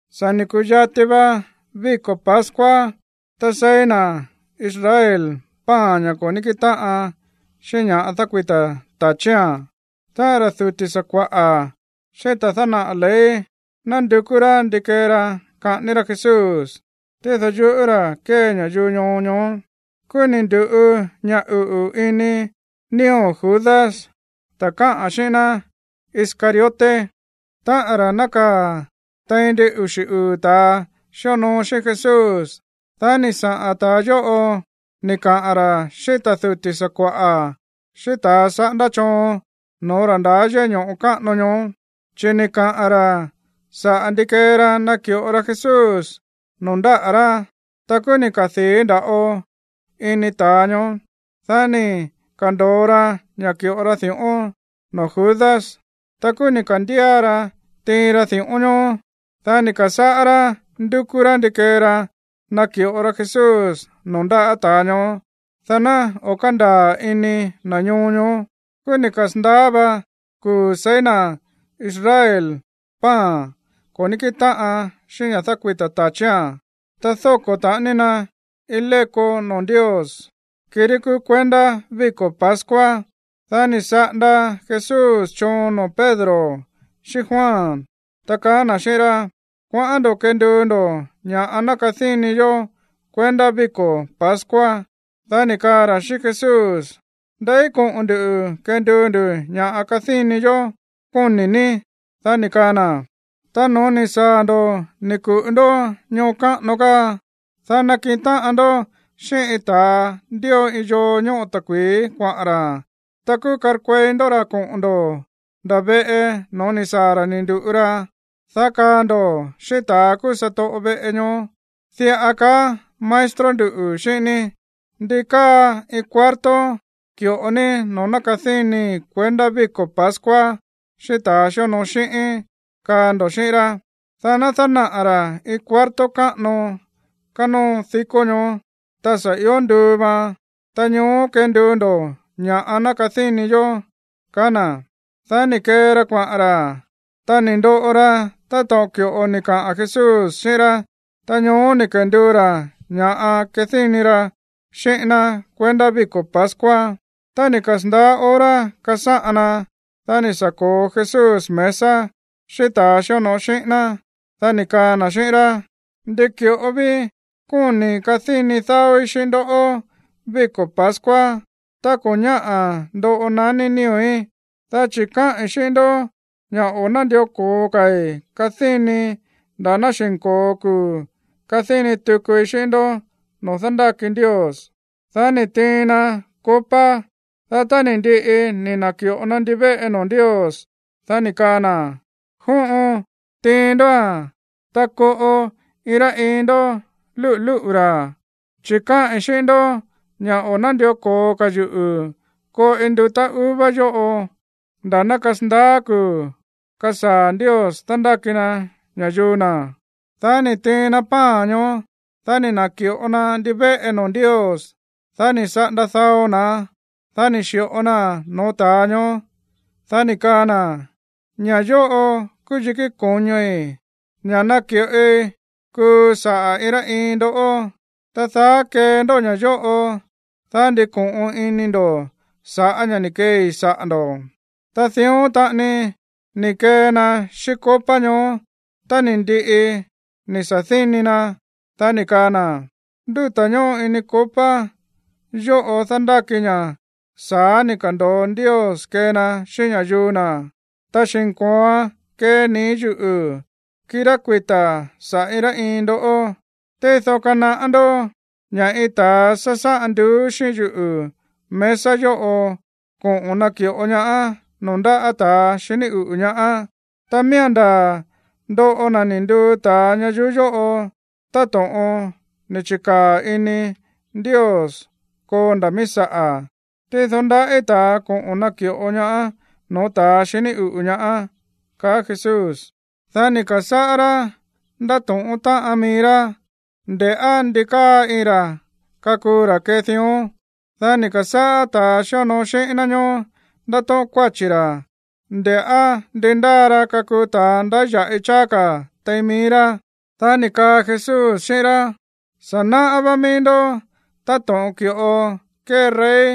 Sa̱ ni̱ ku̱yati va víko̱ pascua, tá seí na̱ Israel pan, ña̱ ko̱ ní kíꞌin táꞌan xíꞌín ña̱ dákuita̱ ta̱chía̱n. Ta ra̱ duti̱ sakua̱ꞌa̱ xíꞌín ta̱ dánaꞌa̱ ley nándukú rá ndi kee ra kaꞌání rá Jesús, tído yuꞌú ra̱ kée ña̱yuu ñoo ñoó. Kúú ni̱ ndu̱ꞌu ña̱ uꞌu̱ ini nío̱ Judas, ta̱ káꞌa̱n xíꞌín ná Iscariote, táꞌa̱n ra̱ nákaa̱ tein ndin uxi̱ uu̱ ta̱ xíonoo xíꞌín Jesús. Dá ni̱ saꞌa̱n ta̱ yóꞌo ni̱ kaꞌa̱n ra̱ xíꞌín ta̱ duti̱ sakua̱ꞌa̱ xíꞌín ta̱a saꞌándá choon no̱ó ra̱ ndaá yéꞌé ño̱ꞌo káꞌano ñoó, chi̱ ni̱ kaꞌa̱n ra̱ saꞌa̱ ndi kee ra naki̱ꞌo ra Jesús noo̱ ndáꞌa̱ rá. Ta kúú ni̱ kadii̱ nda̱ꞌo ini ta̱a ñoó, dá ni̱ ka̱ndo̱o ra ña̱ ki̱ꞌo ra di̱ꞌón noo̱ Judas. Ta kúú ni̱ ka̱ndía ra tiin ra di̱ꞌón ñoó. Dá ni̱ ka̱sáꞌá rá ndúkú rá ndi kee ra naki̱ꞌo ra Jesús noo̱ ndáꞌa̱ ta̱a ñoó, dá ná o̱ kándaa̱ ini na̱ ñoo ñoó. Kúú ni̱ kasa̱ndaá va kuu̱ seí na̱ Israel pan ko̱ ní kíꞌin táꞌan xíꞌín ña̱ dákuita̱ ta̱chía̱n, ta dóko̱ taꞌani na iin léko noo̱ Ndios, kirí kúú kuendá víko̱ pascua. Dá ni̱ saꞌanda Jesús choon noo̱ Pedro xíꞌín Juan, ta kaá na̱ xíꞌín rá: ―Kuaꞌán ndo̱ kenduu ndo̱ ña̱ ná kadíni yó kuendá víko̱ pascua. Dá ni̱ kaa ra̱ xíꞌín Jesús: ―¿Ndeí koꞌo̱n ndu̱ kenduu ndu̱ ña̱ꞌa kadíni yó, kóni̱ ní? Dá ni̱ kaa na̱: ―Ta no̱ó ni̱ saa̱ ndo̱ ni̱ ku̱ꞌu ndó ñoo káꞌano káa, dá nakiꞌin táꞌan ndó xíꞌín iin ta̱a ndío iin yoo ñóꞌo ta̱kui̱í kuaꞌa̱n ra̱. Ta kúú karkuei ndó ra̱ koꞌo̱n ndo̱ nda̱ veꞌe no̱ó ni̱ saa̱ ra̱ ni̱ ndu̱ꞌu ra, dá kaa ndo̱ xíꞌín ta̱ kúú satoꞌo veꞌe ñoó: “Diꞌa kaá maestro nduꞌu̱ xíꞌín ní: ¿Ndi káa iin cuarto ki̱ꞌo ní noo̱ kadínii kuendá víko̱ pascua xíꞌín ta̱a xíonoo xíꞌíín?”, kaa ndo̱ xíꞌín rá. Dá ná dánaꞌa̱ ra̱ iin cuarto káꞌano kánóo dikó ñoó, ta sa̱ ió nduu vaan. Ta ñoó kenduu ndo̱ ña̱ꞌa ná kadíni yó ―kaá na̱. Dá ni̱ kee ra kuaꞌa̱n ra̱. Ta ni̱ ndoꞌo ra táto̱ꞌon ki̱ꞌo ni̱ kaꞌa̱n Jesús xíꞌín rá. Ta ñoó ni̱ kenduu ra̱ ña̱ kadíni ra xíꞌín ná kuendá víko̱ pascua. Tá ni̱ kasa̱ndaá hora kasáꞌan na, dá ni̱ sa̱ ko̱o Jesús mesa xíꞌín ta̱a xíonoo xíꞌín ná. Dá ni̱ kaa na̱ xíꞌín rá: ―Ndi ki̱ꞌo ví kóni̱i̱ kadíni dáóí xíꞌín ndó víko̱ pascua tá ko̱ ñáꞌa̱ ndoꞌo naní nío̱í. Dá chi̱ káꞌi̱n xíꞌín ndó ña̱ o̱ nándió ko̱o ka̱i̱ kadínii nda̱ ná xi̱nko̱o kuu̱ kadíni tukui xíꞌín ndó noo̱ dándáki Ndios. Dá ni̱ tiin na copa. Dá tá ni̱ ndiꞌi ni̱ na̱ki̱ꞌo na ndivéꞌe noo̱ Ndios, dá ni̱ kaa na̱: ―Jóꞌon, tiin ndóa̱n, ta koꞌo iin rá iin ndó lúꞌu̱ lúꞌu̱ ra̱. Chi̱ káꞌi̱n xíꞌín ndó ña̱ o̱ nándió ko̱o ka̱ yuꞌu̱ koꞌi ndutá uva yóꞌo nda̱ ná kasandaá kuu̱ kasaa̱ Ndios dándáki na ña̱yuu na̱. Dá ni̱ tiin na pan ñoó, dá ni̱ na̱ki̱ꞌo na ndivéꞌe noo̱ Ndios. Dá ni̱ saꞌanda dao na̱án, dá ni̱ xi̱ꞌo naa̱n no̱ó ta̱a ñoó. Dá ni̱ kaa na̱: ―Ña̱ yóꞌo kúú yikí ko̱ñoi̱, ña̱ náki̱ꞌoi kuu saꞌa̱ iin rá iin ndoꞌó. Ta daá kee ndó ña̱ yóꞌo, dá ndiko̱ꞌon ini ndo̱ sa̱ꞌá ña̱ ni̱ keei saꞌa̱ ndo̱. Ta dión taꞌani ni̱ kee na xíꞌín copa ñoó tá ni̱ ndiꞌi ni̱ sa̱díni na, dá ni̱ kaa na̱: ―Ndúta̱ ñóꞌo ini copa yóꞌo dándáki ña̱ sa̱á ni̱ ka̱ndo̱o Ndios kee na xíꞌín ña̱yuu na̱, ta xi̱nko̱oan kee nii̱ yuꞌu̱, kirá kuita̱ saꞌa̱ iin rá iin ndó. Tído kanaꞌá ndó ña̱ iin ta̱a sásáꞌan nduú xíꞌín yuꞌu̱ mesa yóꞌo koꞌo̱n naki̱ꞌo ñaá noo̱ ndáꞌa̱ ta̱a xiní uꞌu̱ ñaá. Ta miía̱n ndaa̱ ndoꞌo na̱ ni̱ nduu ta̱a ñayuú yóꞌo táto̱ꞌon ni̱ chi̱kaa̱ ini Ndios koo nda̱ míí saꞌa̱. Tído ndaꞌí ta̱a koꞌo̱n naki̱ꞌo ñaá no̱ó ta̱ xiní uꞌu̱ ñaá ―kaá Jesús. Dá ni̱ ka̱sáꞌá rá ndátóꞌón táꞌan mií rá, nde̱ꞌá ndi káa iin ra kakuu ra̱ kee dión. Dá ni̱ ka̱sáꞌá ta̱ xíonoo xíꞌín ná ñoó ndátóꞌón kuáchi̱ ra̱, nde̱ꞌá ndi ndáa ra kakuu ta̱a ndáya̱ꞌi cháá ka̱ tein mií rá. Dá ni̱ kaa Jesús xíꞌín rá: ―Sa̱ náꞌá vá mií ndó táto̱ꞌon ki̱ꞌo kée rey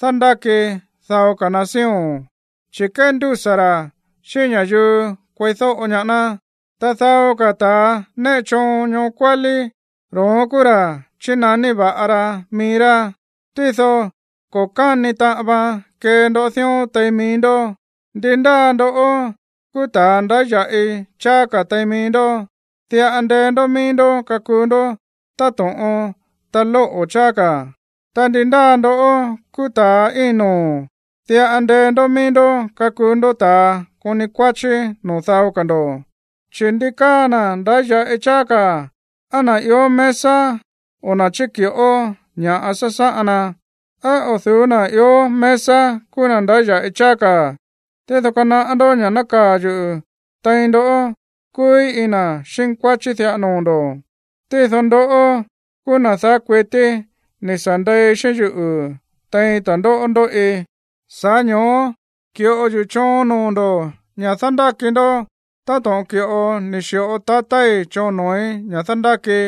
dándáki dao ka̱ nación, chi̱ kéndúsa̱ ra̱ xíꞌín ña̱yuu kueídóꞌo ñaá ná. Ta dao ka̱ ta̱ néꞌe choon ñoo kuálí, ro̱ón kúú ra̱ chínaní va̱ꞌa ra mií rá. Tído ko̱ káni taꞌan vaan kee ndó dión tein mií ndó. Ndi ndáa ndoꞌó kúú ta̱a ndáya̱ꞌi cháá ka̱ tein mií ndó, diꞌa ndee ndó mií ndó kakuu ndó táto̱ꞌon ta̱ lóꞌo̱ cháá ka̱. Ta ndi ndáa ndoꞌó kúú ta̱a íin noo̱, diꞌa ndee ndó mií ndó kakuu ndó ta̱a koni kuáchí noo̱ dao ka̱ ndo̱. Chi̱, ¿ndi káa na̱ ndáya̱ꞌi cháá ka̱, á na̱ ió mesa o na̱ chíki̱ꞌo ña̱ꞌa sasáꞌan na? ¿Á o̱ du̱ú na̱ ió mesa kúú na̱ ndáya̱ꞌi cháá ka̱? Tído kanaꞌá ndó ña̱ nákaa̱ yuꞌu̱ tein ndó kúúí iin na̱ xínkuáchí diꞌa noo̱ ndo̱. ’Ta ndoꞌó kúú na̱ daá kuití ni̱ sa̱ ndei xíꞌín yuꞌu̱ tein ta̱ndóꞌó ndóꞌi, sa̱ꞌá ño̱ó ki̱ꞌo yuꞌu̱ choon noo̱ ndo̱ ña̱ dándáki ndó táto̱ꞌon ki̱ꞌo ni̱ xi̱ꞌo tatái̱ choon noo̱í ña̱ dándákii,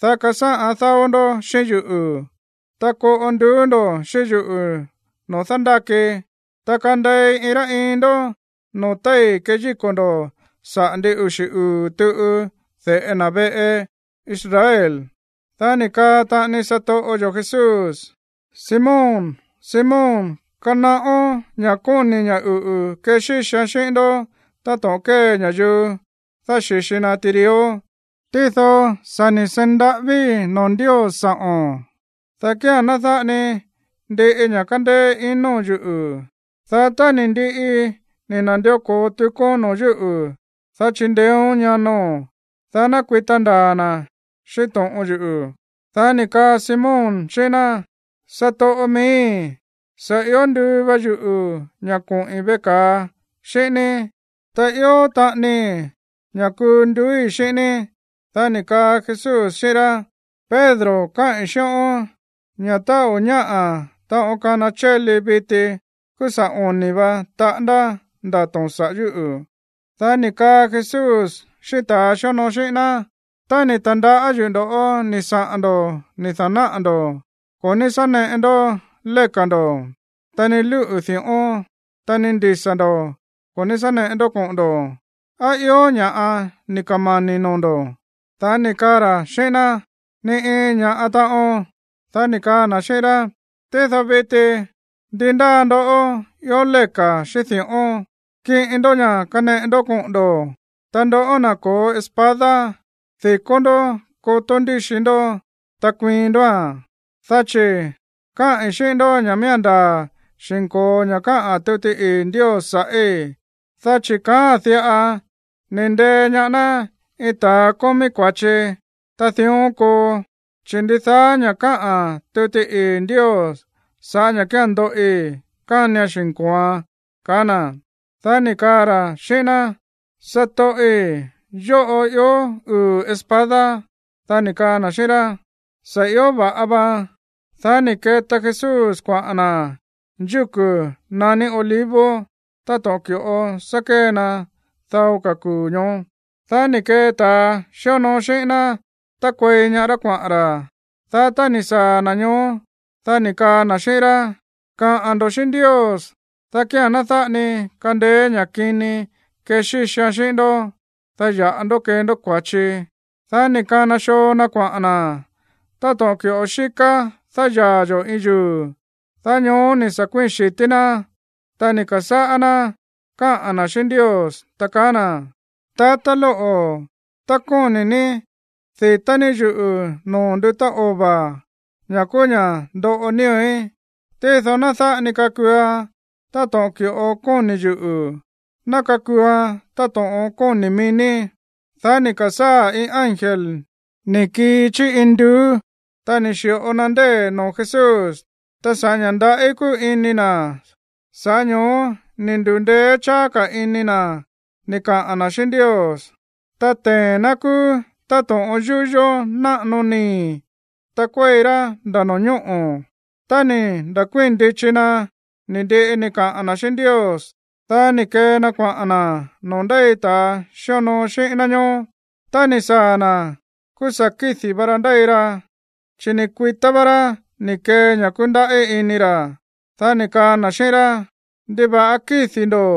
dá kasáꞌan dáó ndó xíꞌín yuꞌu̱, ta koꞌo nduú ndo̱ xíꞌín yuꞌu̱ noo̱ dándákii, ta kandei iin rá iin ndó noo̱ téi̱ keyíko̱ ndo̱ saꞌa̱ ndin uxi̱ uu̱ tuꞌu de̱ꞌe na̱ veꞌe Israel. Dá ni̱ kaa taꞌani satoꞌo yo̱ Jesús: ―Simón, Simón, kanaꞌón ña̱ kóni̱ ña̱ uꞌu̱ kexíxian xíꞌín ndó táto̱ꞌon kée ña̱yuu dáxi̱xi na tirió. Tído sa̱ ni̱ seí ndaꞌávíi̱ noo̱ Ndios sa̱ꞌo̱n, dá kía̱n ná dáꞌa ni ndiꞌi ña̱ kándéé ino̱n yuꞌu̱. Dá tá ni̱ ndiꞌi ni̱ na̱ndió ko̱o tukón noo̱ yúꞌu̱, dá chindeéón ñano̱n, dá ná kuita ndaa̱ na̱ xíꞌín to̱ꞌon yuꞌu̱. Dá ni̱ kaa Simón xíꞌín ná: ―Satoꞌo miíi̱, sa̱ ió nduu va yuꞌu̱ ña̱ koꞌi̱n veꞌe ka̱a xíꞌín ní, ta ió taꞌanii ña̱ kuu nduúi̱ xíꞌín ní. Dá ni̱ kaa Jesús xíꞌín rá: ―Pedro, káꞌi̱n xíꞌón ña̱ tá o̱ ñáꞌa̱ taꞌon kana chéli viti, kúú sa̱ oni̱ va taꞌándá ndato̱n sa̱ꞌá yuꞌu̱. Dá ni̱ kaa Jesús xíꞌín ta̱a xíonoo xíꞌín ná: ―Tá ni̱ ta̱ndaꞌá yuꞌu̱ ndo̱ꞌó ni̱ saꞌa̱n ndo̱ ni̱ da̱náꞌa̱ ndo̱, ko̱ ní sá neꞌe ndó léka̱ ndo̱, ta ni lúꞌu̱ di̱ꞌón, ta ni ndisa̱ ndo̱ ko̱ ní sá neꞌe ndó koꞌo̱n ndo̱. ¿Á ió ña̱ꞌa ni̱ kamani̱ noo̱ ndo̱? Dá ni̱ kaa ra̱ xíꞌín ná: ―Ni iin ña̱ꞌa taꞌon. Dá ni̱ kaa na̱ xíꞌín rá: ―Tído viti, ndi ndáa ndoꞌó ió léka̱ xíꞌín di̱ꞌón, kiꞌin ndó ña̱ kaneꞌe ndó koꞌo̱n ndo̱. Ta ndoꞌó, na̱ ko̱ó espada, di̱kó ndó kotó ndíxi ndó, ta kuiin ndóa̱n. Dá chi̱ káꞌi̱n xíꞌín ndó ña̱ miía̱n xi̱nko̱o ña̱ káꞌa̱n tuti ii̱ Ndios sa̱ꞌí, dá chi̱ kaáa̱n diꞌa: “Ni̱ ndee ñaá ná iin ta̱a kómí kua̱chi.” Ta dión koo, chi̱ ndidaá ña̱ káꞌa̱n tuti ii̱ Ndios sa̱ꞌá ña̱ kía̱n ndoꞌi, kánian xi̱nko̱oan ―kaá na̱. Dá ni̱ kaa ra̱ xíꞌín ná: ―Satoꞌi̱, yóꞌo ió uu̱ espada. Dá ni̱ kaa na̱ xíꞌín rá: ―Sa̱ ió va̱ꞌa va. Dá ni̱ keta Jesús kuaꞌa̱n na̱ yúku̱ naní Olivos táto̱ꞌon ki̱ꞌo sá kée na dao ka̱ kuu̱ ñoó. Dá ni̱ kee ta̱ xíonoo xíꞌín ná tákuei ñaá rá kuaꞌa̱n ra̱. Dá tá ni̱ saa̱ na̱ ñoó, dá ni̱ kaa na̱ xíꞌín rá: ―Kaꞌa̱n ndo̱ xíꞌín Ndios, dá kía̱n ná dáꞌa ni kandeé ña̱ kini kexíxian xíꞌín ndó, dá ya̱ꞌa ndó kee ndó kua̱chi. Dá ni̱ kana xoo na kuaꞌa̱n na̱ táto̱ꞌon ki̱ꞌo xíká dáyaa̱ yo̱ iin yuu̱. Dá ñoó ni̱ sa̱ kuíi̱n xi̱tí ná, ta ni̱ ka̱sáꞌá ná káꞌa̱n na̱ xíꞌín Ndios, ta kaá na̱: ―Táꞌa̱ lóꞌo̱, tá kóni̱ ní, di̱tá ní yuꞌu̱ noo̱ ndutá ova̱, ña̱ kúú ña̱ ndóꞌo nío̱í. Tído ná dáꞌa ni kakuuan táto̱ꞌon ki̱ꞌo kóni̱ yuꞌu̱. Ná kakuuan táto̱ꞌon kóni̱ mií ní. Dá ni̱ ka̱sáa̱ iin ángel ni̱ kii chí induú, ta ni̱ xi̱ꞌo na ndée̱ noo̱ Jesús. Ta sa̱ꞌá ña̱ ndaꞌí kúu ini na̱, sa̱ꞌá ño̱ó ni̱ ndu̱ndeé cháá ka̱ ini na̱ ni̱ kaꞌa̱n na̱ xíꞌín Ndios. Ta tee̱n ná kúú táto̱ꞌon yúyó náꞌano nii̱, ta kuéi rá nda̱ no̱ñóꞌo̱. Tá ni̱ na̱kuíi̱n ndichi na̱ ni̱ ndiꞌi ni̱ kaꞌa̱n na̱ xíꞌín Ndios, dá ni̱ kee na kuaꞌa̱n na̱ noo̱ ndéi ta̱ xíonoo xíꞌín ná ñoó. Tá ni̱ saa̱ na̱, kúú sa̱ kídi̱ va ra ndéi ra, chi̱ ni̱ kuitá vá rá ni̱ kee ña̱ kúndaꞌí ini ra̱. Dá ni̱ kaa na̱ xíꞌín rá: ―¿Ndiva̱ꞌa kídi̱ ndo̱?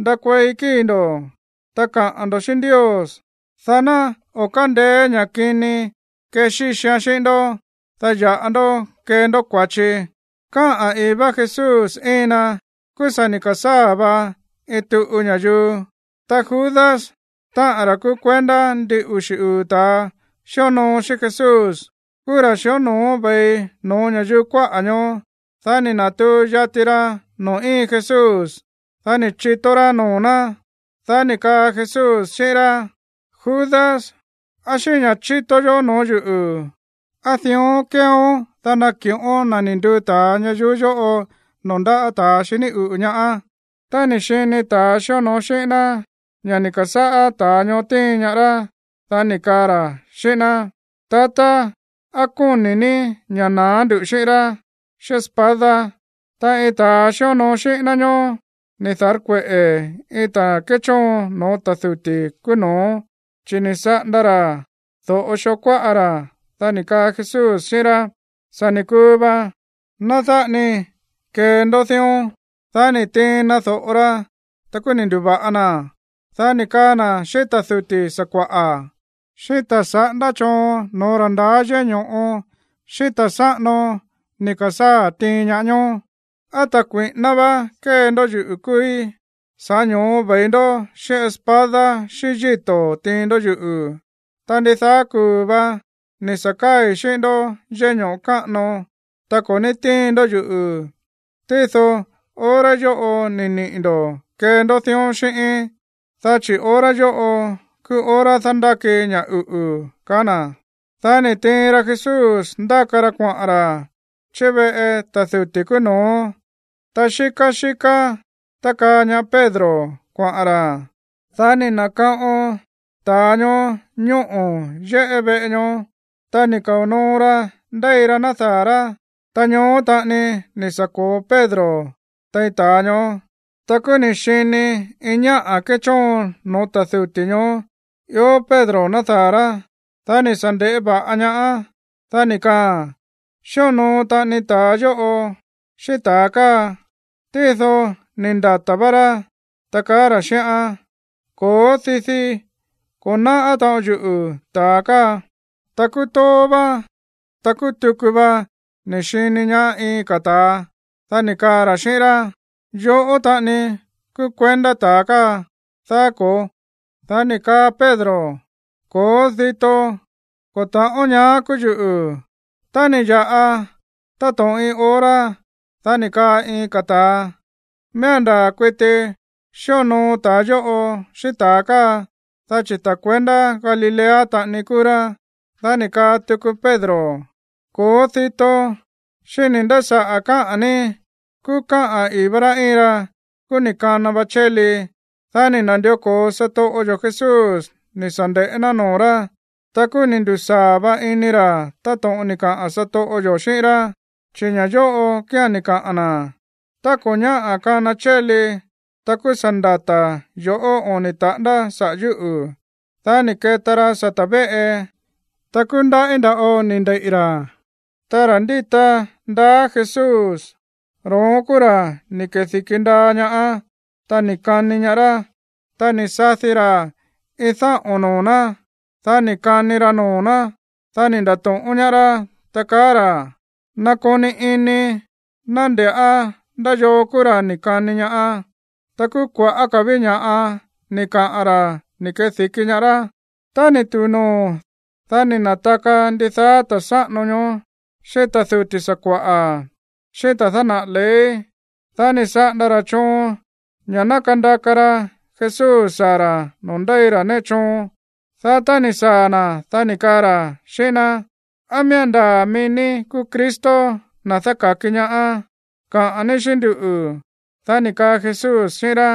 Ndakuei kíi̱ ndo̱, ta kaꞌa̱n ndo̱ xíꞌín Ndios, dá ná o̱ kándeé ña̱ kini kexíxian xíꞌín ndó, dá ya̱ꞌa ndó kee ndó kua̱chi. Káꞌa̱n i̱í vá Jesús íin na, kúú sa̱ ni̱ ka̱sáa̱ va iin tuꞌu ña̱yuu. Ta Judas, táꞌa̱n ra̱ kúú kuendá ndin uxi̱ uu̱ ta̱a xíonoo xíꞌín Jesús, kúú ra̱ xíonoo ve̱i no̱ó ña̱yuu kuáꞌa̱ ñoó. Dá ni̱ na̱tuu yati ra noo̱ íin Jesús, dá ni̱ chitó rá noo̱ ná. Dá ni̱ kaa Jesús xíꞌín rá: ―Judas, ¿á xíꞌín ña̱ chító yoꞌó noo̱ yúꞌu̱, á dión kéeón, dá nakiꞌón na̱ ni̱ nduu ta̱a ñayuú yóꞌo noo̱ ndáꞌa̱ ta̱a xiní uꞌu̱ ñaá? Tá ni̱ xini ta̱a xíonoo xíꞌín ná ña̱ ni̱ ka̱sáꞌá ta̱a ñoó tíin ñaá rá, dá ni̱ kaa ra̱ xíꞌín ná: ―Tatá, ¿á kóni̱ ní ña̱ na̱á ndu̱ xíꞌín rá xíꞌín espada? Ta iin ta̱a xíonoo xíꞌín ná ñoó ni̱ da̱rkueꞌe̱ iin ta̱ kéchóon no̱ó ta̱ duti̱ kúú no̱ó, chi̱ ni̱ saꞌanda ra̱ do̱ꞌo xoo kuáꞌa ra̱. Dá ni̱ kaa Jesús xíꞌín rá: ―Sa̱ ni̱ kuu va. Ná dáꞌa ni kee ndó dión. Dá ni̱ tiin na do̱ꞌo ra, ta kúú ni̱ ndu̱va̱ꞌa naa̱n. Dá ni̱ kaa na̱ xíꞌín ta̱ duti̱ sakua̱ꞌa̱, xíꞌín ta̱ saꞌándá choon no̱ó ra̱ ndaá yéꞌé ño̱ꞌo, xíꞌín ta̱ sáꞌano ni̱ ka̱sáa̱ tiin ñaá ñoó: ―¿Á ta̱ kui̱ꞌíná vá kée ndó yuꞌu̱ kúúí, sa̱ꞌá ño̱ó ve̱i ndó xíꞌín espada xíꞌín yíto̱ tiin ndó yuꞌu̱? Ta ndidaá kuu̱ vá ni̱ sa̱ káa̱i̱ xíꞌín ndó yéꞌé ño̱ꞌo káꞌano, ta ko̱ ní tiin ndó yuꞌu̱. Tído hora yóꞌo ni̱ niꞌi̱ ndo̱ kee ndó dión xíꞌíín, dá chi̱ hora yóꞌo kúú hora dándáki ña̱ uꞌu̱ ―kaá na̱. Dá ni̱ tiin ra Jesús ndáka ra kuaꞌa̱n ra̱ chí veꞌe ta̱ duti̱ kúú no̱ó. Ta xíká xíká tákaa ñaá Pedro kuaꞌa̱n ra̱. Dá ni̱ na̱kaꞌon ta̱a ñoó ñóꞌo̱ yéꞌé veꞌe ñoó. Ta ni̱ kao̱ noo ra ndéi ra nádaa̱ rá. Ta ñoó taꞌani ni̱ sa̱ ko̱o Pedro tein ta̱a ñoó. Ta kúú ni̱ xini iin ñáꞌa̱ kéchóon no̱ó ta̱ duti̱ ña̱ ñoó ió Pedro nádaa̱ rá, dá ni̱ sa̱ nde̱ꞌé va̱ꞌa ñaáán, dá ni̱ kaaa̱n: ―Xíonoo taꞌani ta̱a yóꞌo xíꞌín ta̱a káa. Tído ni̱ ndata̱ vá rá, ta kaá ra̱ xíꞌán: ―Ko̱ó, didi, ko̱ náꞌá taꞌon yuꞌu̱ ta̱a káa. Ta kúú tóó vá, ta kúú tuku va ni̱ xini ñaá iin ka̱ ta̱a. Dá ni̱ kaa ra̱ xíꞌín rá: ―Yoꞌó taꞌani kúú kuendá ta̱a káa, ¿daá ko̱ó? Dá ni̱ kaa Pedro: ―Ko̱ó, dito, ko̱ ta̱ꞌón ñaá kúú yuꞌu̱. Tá ni̱ ya̱ꞌa táto̱ꞌon iin hora, dá ni̱ kaa iin ka̱ ta̱a: ―Miía̱n ndaa̱ kuiti xíonoo ta̱a yóꞌo xíꞌín ta̱a káa, dá chi̱ ta̱ kuendá Galilea taꞌani kúú rá. Dá ni̱ kaa tuku Pedro: ―Ko̱ó, dito. Xíni̱ nda̱ saꞌa̱ káꞌa̱n ní. Kúú káꞌa̱n i̱í vá rá íin ra, kúú ni̱ kana va chéli. Dá ni̱ na̱ndió ko̱o satoꞌo yo̱ Jesús ni̱ sa̱ nde̱ꞌé ná noo̱ rá. Ta kúú ni̱ ndu̱sáa̱ va ini ra̱ táto̱ꞌon ni̱ kaꞌa̱n satoꞌo yo̱ xíꞌín rá, chi̱ ña̱ yóꞌo kía̱n ni̱ kaꞌa̱n na̱: “Tá ko̱ ñáꞌa̱ kana chéli, ta kúú sa̱ ndata̱ yo̱ꞌó oni̱ taꞌándá saꞌa̱ yúꞌu̱.” Dá ni̱ keta ra sata̱ véꞌe, ta kúú ndaꞌí nda̱ꞌo ni̱ ndeiꞌi̱ ra̱. Ta ra̱ ndíta ndaá Jesús, ro̱ón kúú ra̱ ni̱ kedi̱ki ndaa ñaá, ta ni̱ kani ñaá rá. Ta ni̱ sadi ra̱ iin dáꞌo̱n noo̱ ná, dá ni̱ kani ra noo̱ ná. Dá ni̱ nda̱to̱ꞌón ñaá rá, ta kaá ra̱: ―Nakoni ini, ná nde̱ꞌá ndá yoo kúú ra̱ ni̱ kani ñaá. Ta kúú kua̱ꞌá ka̱ ví ña̱ꞌa ni̱ kaꞌa̱n ra̱ ni̱ kedi̱ki ñaá rá. Tá ni̱ tu̱u noo̱, dá ni̱ na̱taka ndidaá ta̱ sáꞌano ñoo, xíꞌín ta̱ duti̱ sakua̱ꞌa̱, xíꞌín ta̱ dánaꞌa̱ ley. Dá ni̱ saꞌanda ra̱ choon ña̱ ná kandaka ra Jesús saa̱ ra̱ noo̱ ndéi ra néꞌe ra choon. Dá tá ni̱ saa̱ na̱, dá ni̱ kaa ra̱ xíꞌín ná: ―¿Á miía̱n ndaa̱ mií ní kúú Cristo, na̱ dáka̱ki ñaá? Kaꞌa̱n ní xíꞌín nduꞌu̱. Dá ni̱ kaa Jesús xíꞌín rá: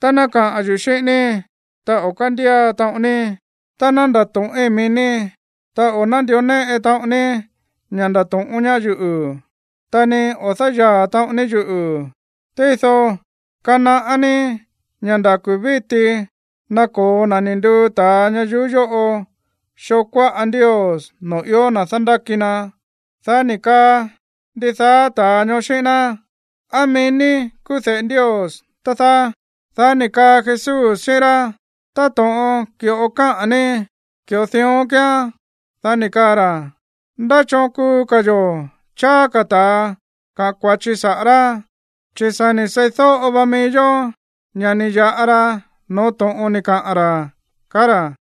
―Tá ná kaꞌa̱n yuꞌu̱ xíꞌín ní, ta o̱ kándía taꞌon ní. Tá ná ndato̱ꞌín mií ní, ta o̱ nándió néꞌe taꞌon ní ña̱ ndato̱ꞌón ñaá yuꞌu̱, ta ni o̱ dáyaa̱ taꞌon ní yuꞌu̱. Tído kanaꞌá ní ña̱ nda̱ kuu̱ víti ná ko̱o na̱ ni̱ nduu ta̱a ñayuú yóꞌo xoo kuáꞌa Ndios noo̱ ió na̱ dándáki na. Dá ni̱ kaa ndidaá ta̱a ñoó xíꞌín ná: ―¿Á mií ní kúú de̱ꞌe Ndios, tá dáá? Dá ni̱ kaa Jesús xíꞌín rá: ―Táto̱ꞌon ki̱ꞌo káꞌa̱n ní, ki̱ꞌo dión kíán. Dá ni̱ kaa ra̱: ―¿Ndá choon kuu ka̱ yo̱ cháá ka̱ ta̱a kaꞌa̱n kua̱chi saꞌa̱ rá? Chi̱ sa̱ ni̱ seídóꞌo va mií yó ña̱ ni̱ ya̱ꞌa ra no̱ó to̱ꞌon ni̱ kaꞌa̱n ra̱ ―kaá ra̱.